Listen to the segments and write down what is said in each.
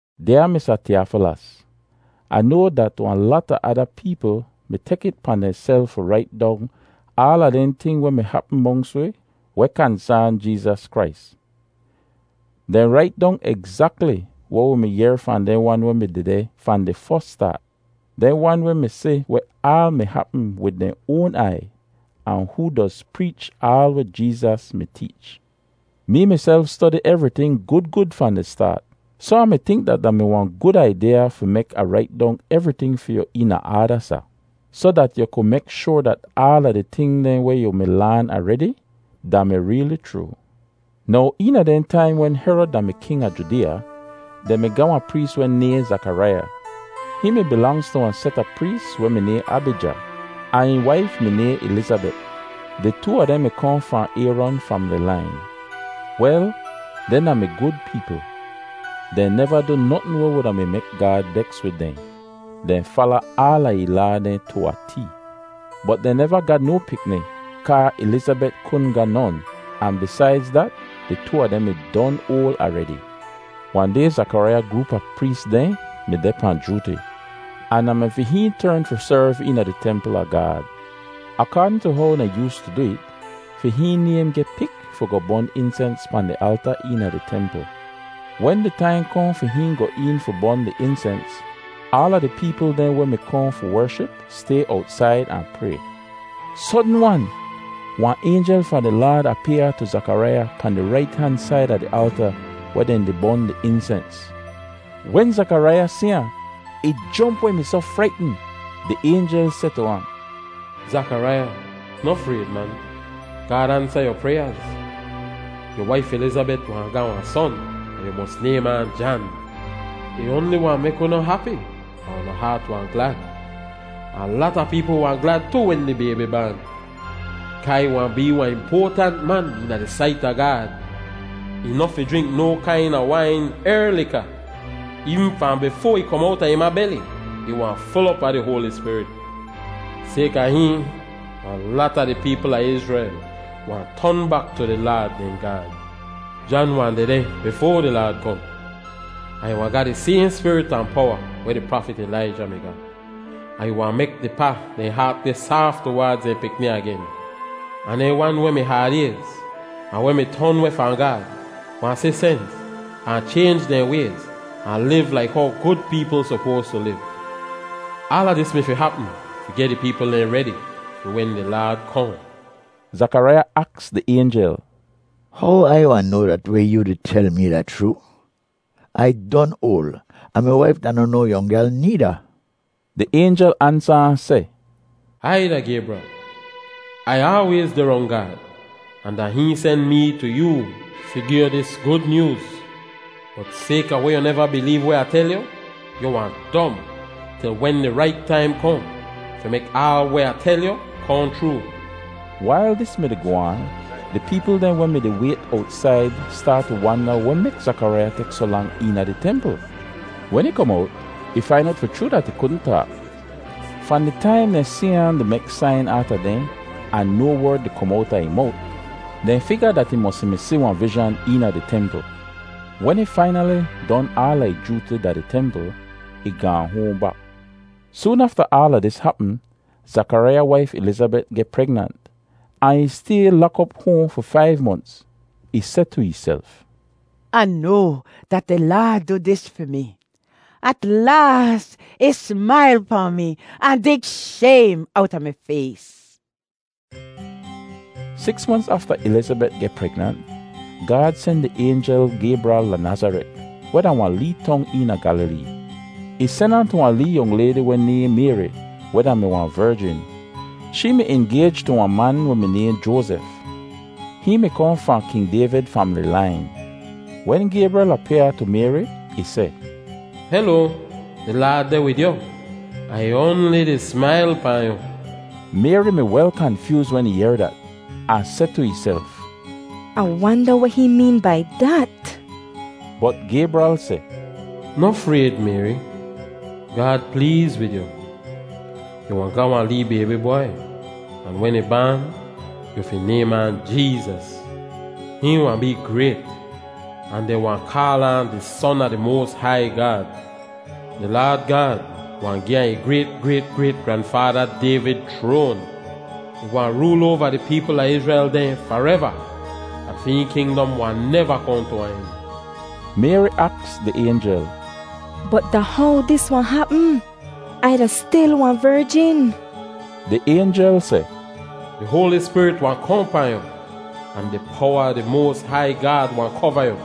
Dyaa Misa Tiyofilos, Ah noa dat wahn lata ada peepl mi tek it pahn dehnself fi rait dong aala dehn ting weh mi hapm monks wi weh kansaan Jeezas Krais. Dehn rait dong egzakli weh wi mi yehr fahn dehn wan weh mi dehdeh fahn di fos staat—dehn wan weh mi si weh aal mi hapm wid dehn oan aiy, ahn hoo doz preech aal weh Jeezas mi teech. Mee miself stodi evriting gud gud fahn di staat, soh Ah mi tink dat da mi wahn gud aidyaa fi mek Ah rait dong evriting fi yu eena aada, Sa, soh dat yu ku mek shoar dat aala di ting dehn weh yu mi laan aredi da-mi reeli chroo. Now, eena dehn taim wen Herod da-mi king a Judeeya, dehn mi ga wahn prees weh nayhn Zakaraiya. Hihn mi bilangz tu wahn set a prees weh mi nayhn Abija, ahn ih waif mi nayhn Ilizabet. Di too a dehn mi kohn fahn Ayron famili lain. Wel, dehn da-mi gud peepl. Dehn neva du notn weh wuda mi mek Gaad beks wid dehn. Dehn fala aala ih laa dehn tu a tee. Bot dehn neva ga no pikni kaa Ilizabet kudn ga non, ahn bisaidz dat, di too a dehn mi don oal aredi. Wahn day Zakaraiya groop a prees dehn mi deh pahn jooti, ahn da mi fi hihn tern fi serv eena di templ a Gaad. Akaadn tu how dehn yoostu du it, fi hihn naym geh pik fi goh bon insens pahn di alta eena di templ. Wen di taim kohn fi hihn goh een fi bon di insens, aala di peepl dehn weh mi kohn fi wership stay owtsaid ahn pray. Sodn-wan, wahn aynjel fahn di Laad apyaa tu Zakaraiya pahn di rait han said a di alta weh dehn di bon di insens. Wen Zakaraiya si ahn, ih jomp weh ih mi soh fraitn. Di aynjel seh tu ahn, “Zakaraiya, noh frayd, man! Gaad ansa yu pryaaz. Yu waif Ilizabet wahn ga wahn son, ahn yu mos naym ahn Jan. Ih oanli wahn mek unu hapi ahn unu haat wahn glad, ahn lata peepl wahn glad tu wen di baybi baan, kaa ih wahn bee wahn impoatant man eena di sait a Gaad. Ih noh fi jrink no kaina wain er lika. Eevn fahn bifoa ih kom owta ih ma beli, ih wahn ful op a di Hoali Spirit. Sayka hihn, wahn lata di peepl a Izrel wahn ton bak tu di Laad dehn Gaad. Jan wahn dehdeh bifoa di Laad kohn, ahn ih wahn ga di sayhn spirit ahn powa weh di prafit Ilaija mi ga, ahn ih wahn mek di pa dehn haat geh saaf tuwaadz dehn pikni agen. Ahn dehn wan weh mi haad-ayz ahn weh mi ton weh fahn Gaad wahn si sens ahn chaynj dehn wayz ahn liv laik how gud peepl sopoas tu liv. Aala dis mi fi hapm fi geh di peepl dehn redi fi wen di Laad kohn.” Zakaraiya aks di aynjel, “How Ai wahn noa dat weh yoo di tel mi da chroo? Ai don oal, ahn mi waif da noh no yong gyal needa.” Di aynjel ansa ahn seh, “Ai da Gaybral! Ai aalwayz deh rong Gaad, ahn da hihn sen mee tu yoo fi gi yu dis Gud Nyooz. Bot sayka weh yu neva bileev weh Ah tel yu, yu wahn dom til wen di rait taim kohn fi mek aal weh Ah tel yu kohn chroo.” Wail dis mi-di goh aan, di peepl dehn weh mi-di wayt owtsaid staat tu wanda weh mek Zakaraiya tek soh lang eena di templ. Wen ih kom owt, ih fain owt fi chroo dat ih kudn taak. Fahn di taim dehn si ahn di mek sain aata dehn ahn no werd di kom owta ih mowt, dehn figa dat ih mosi mi si wahn vizhan eena di templ. Wen ih fainali don aala ih jooti da di templ, ih gaahn hoahn bak. Soon afta aala dis hapm, Zakaraiya waif Ilizabet geh pregnant, ahn ih stay lak op hoahn fi faiv monts. Ih seh tu ihself, “Ah noa dat di Laad du dis fi mi. At laas ih smail pahn mi ahn dig shaym owta mi fays.” Siks monts afta Ilizabet geh pregnant, Gaad sen di aynjel Gaybral da Nazaret, weh da wahn lee tong eena Gyalilee. Ih sen ahn tu wahn lee yong laydi weh nayhn Mayri weh da-mi wahn verjin. Shee mi ingayj tu wahn man weh mi nayhn Joazef. Hihn mi kohn fahn King Dayvid famili lain. Wen Gaybral apyaa tu Mayri, ih seh, “Heloa! Di Laad deh wid yu, ahn ih oanli di smail pahn yu.” Mayri mi wel kanfyooz wen ih yehr dat, ahn seh tu ihself, “Ah wanda weh hihn meen bai dat?” Bot Gaybral seh, “Noh frayd, Mayri. Gaad pleez wid yu. Yu wahn ga wahn lee baybi bwai, ahn wen ih baan, yu fi naym ahn Jeezas. Hihn wahn bee grayt, ahn dehn wahn kaal ahn di Son a di moas hai Gaad. Di Laad Gaad wahn gi ahn ih grayt-grayt-grayt-granfaada Dayvid chroan. Ih wahn rool oava di peepl a Izrel dehn fareva, ahn fi hihn kingdom wahn neva kohn tu wahn en.” Mayri aks di aynjel, “Bot da how dis wahn hapm? Ai da stil wahn verjin.” Di aynjel seh, “Di Hoali Spirit wahn kohn pahn yu, ahn di powa a di moas hai Gaad wahn kova yu.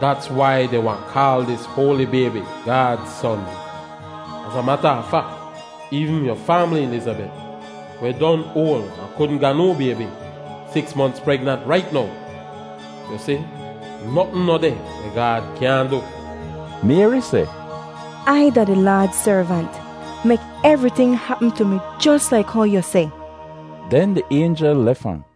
Dats wai dehn wahn kaal dis hoali baybi Gaad Son. Az a mata a fak, eevn yu faamli Ilizabet, weh don oal ahn kudn ga no baybi, siks monts pregnant rait now! Yu si, notn noh deh weh Gaad kyaahn du.” Mayri seh, “Ai da di Laad servant. Mek evriting hapm tu mi jos laik how yu seh.” Den di aynjel lef ahn.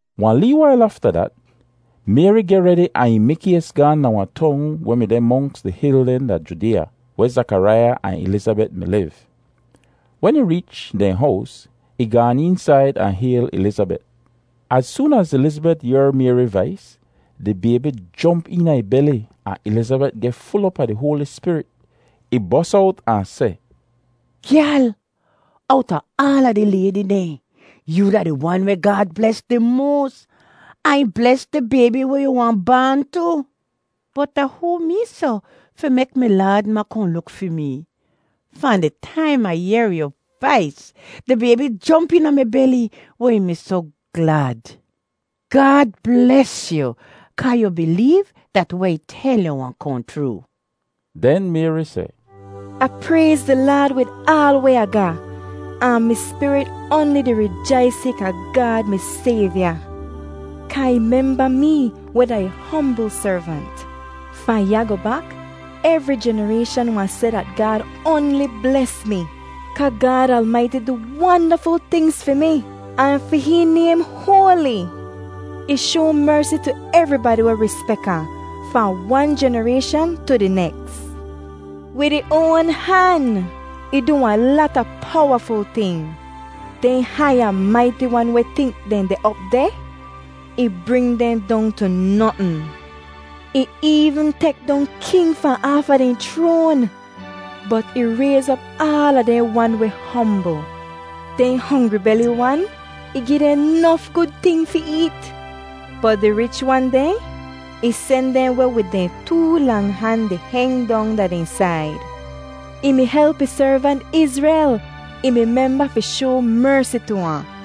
Wahn lee wail afta dat, Mayri geh redi ahn ih mikays gaahn da wahn tong weh mi deh monks di hil dehn da Judeeya, weh Zakaraiya ahn Ilizabet mi liv. Wen ih reech dehn hows, ih gaan eensaid ahn hayl Ilizabet. Az soon az Ilizabet yehr Mayri vais, di baybi jomp eena ih beli ahn Ilizabet geh ful op a di Hoali Spirit. Ih bos owt ahn seh, “Gyal, owta aala di laydi dehn, yoo da di wan weh Gaad bles di moas, ahn ih bles di baybi weh yu wahn baan tu. Bot da hoo mee soh fi mek mi Laad ma kohn luk fi mee? Fahn di taim Ah yehr yu vais, di baybi jomp eena mi beli weh ih mi soh glad. Gaad bles yu kaa yu bileev dat weh ih tel yu wahn kohn chroo!” Den Mayri seh, “Ah prayz di Laad wid aal weh Ah ga, ahn mi spirit oanli di rijais sayka Gaad mi Sayvya, kaa ih memba mee, weh da ih hombl servant. Fahn ya goh bak, evri jenarayshan wahn seh dat Gaad oanli bles mi. Kaa Gaad Almaiti du wandaful tingz fi mi, ahn fi hihn naym hoali! Ih shoa mersi tu evribadi weh rispek ahn, fahn wan jenarayshan tu di neks. Wid ih oan han ih du wahn lata powaful ting. Dehn hai ahn maiti wan weh tink dehn deh op deh, ih bring dehn dong tu notn. Ih eevn tek dong king fahn aafa dehn chroan, bot ih rayz op aala dehn wan weh hombl. Dehn hongri beli wan, ih gi dehn nof gud ting fi eet, bot di rich wan dehn, ih sen dehn weh wid dehn too lang han di heng dong da dehn said. Ih mi help ih servant Izrel; ih mi memba fi shoa mersi tu ahn.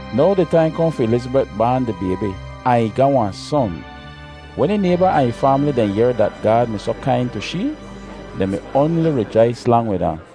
Now di taim kohn fi Ilizabet baan di baybi, ahn ih ga wahn son. Wen ih nayba ahn ih faamli dehn yehr dat Gaad mi soh kain tu shee, dehn mi oanli rijais lang wid ahn.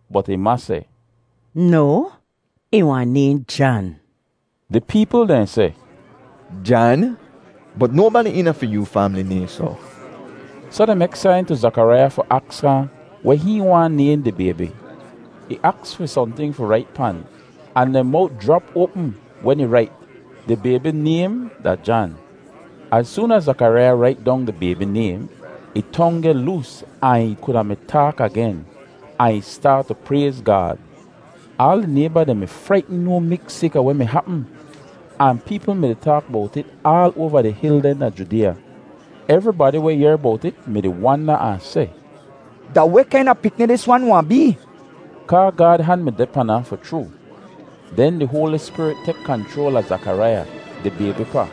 bot ih ma seh, “No! Ih wahn nayhn Jan.” Di peepl dehn seh, “Jan! Bot nobadi eena fi yu faamli nayhn soh.” Soh dehn mek sain tu Zakaraiya fi aks ahn weh hihn waahn naym di baybi. Ih aks fi sohnting fi rait pan, ahn dehn mowt jrap oapm wen ih rait, “Di baybi naym da Jan.” Az soon az Zakaraiya rait dong di baybi naym, ih tong geh loos ahn ih kuda mi taak agen, ahn ih staat tu prayz Gaad. Aal di nayba dehn mi fraitn no miks sayka weh mi hapm, ahn peepl mi-di taak bowt it aal oava di hil dehn da Judeeya. Evribadi weh yehr bowt it mi-di wanda ahn seh, “Da weh kaina pikni dis wan wahn bee?” Kaa Gaad han mi deh pan ahn fi chroo. Den di Hoali Spirit tek kanchroal a Zakaraiya, di baybi pa,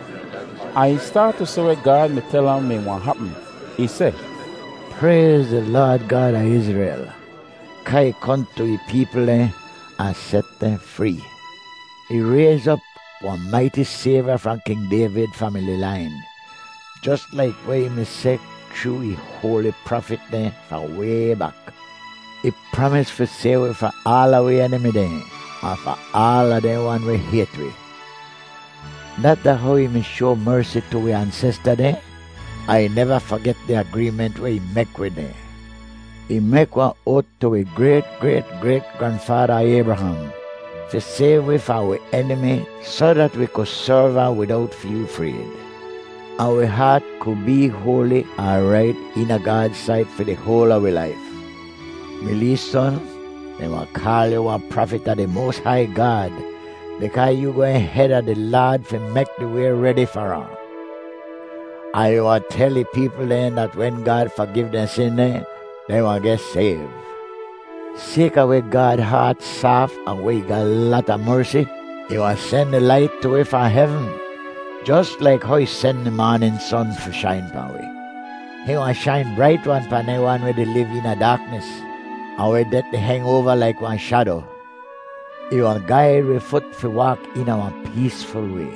ahn ih staat tu seh weh Gaad mi tel ahn mi wahn hapm. Ih seh, “Prayz di Laad Gaad a Izrel, kaa ih kohn tu ih peepl dehn ahn set dehn free. Ih rayz op wahn maiti Sayvya fahn King Dayvid famili lain, jos laik weh ih mi seh chroo ih hoali prafit dehn fahn way bak. Ih pramis fi sayv wi fahn aala wi enimi dehn, ahn fahn aala dehn wan weh hayt wi. Dat da how ih mi shoa mersi tu wi ansesta dehn, ahn ih neva faget di agreement weh ih mek wid dehn. Ih mek wahn oat tu wi grayt-grayt-grayt-granfaada Aybraham, fi sayv wi fahn wi enimi soh dat wi ku serv ahn widowt feel frayd, Ahn wi haat ku bee hoali ahn rait eena Gaad sait fi di hoal a wi laif. Mi lee son, dehn wahn kaal yu wahn prafit a di moas hai Gaad, bikaa yoo gwehn heda di Laad fi mek di way redi far ahn. Ahn yu wahn tel ih peepl dehn dat wen Gaad fagiv dehn sin dehn, dehn wahn geh sayv. Sayka weh Gaad haat saaf ahn weh ih ga lata mersi, ih wahn sen di Lait tu wi fahn hevn, jos laik how ih sen di maanin son fi shain pahn wi. Hihn wahn shain brait-wan pahn dehn wan weh di liv eena daaknis, ahn weh det di heng oava laik wahn shado. Ih wahn gaid wi fut fi waak eena wahn peesful way.”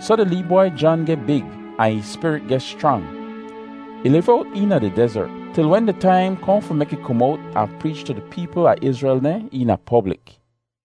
Soh di lee bwai Jan geh big ahn ih spirit geh schrang. Ih liv owt eena di dezert til wen di taim kohn fi mek ih kom owt ahn preech tu di peepl a Izrel dehn eena poblik.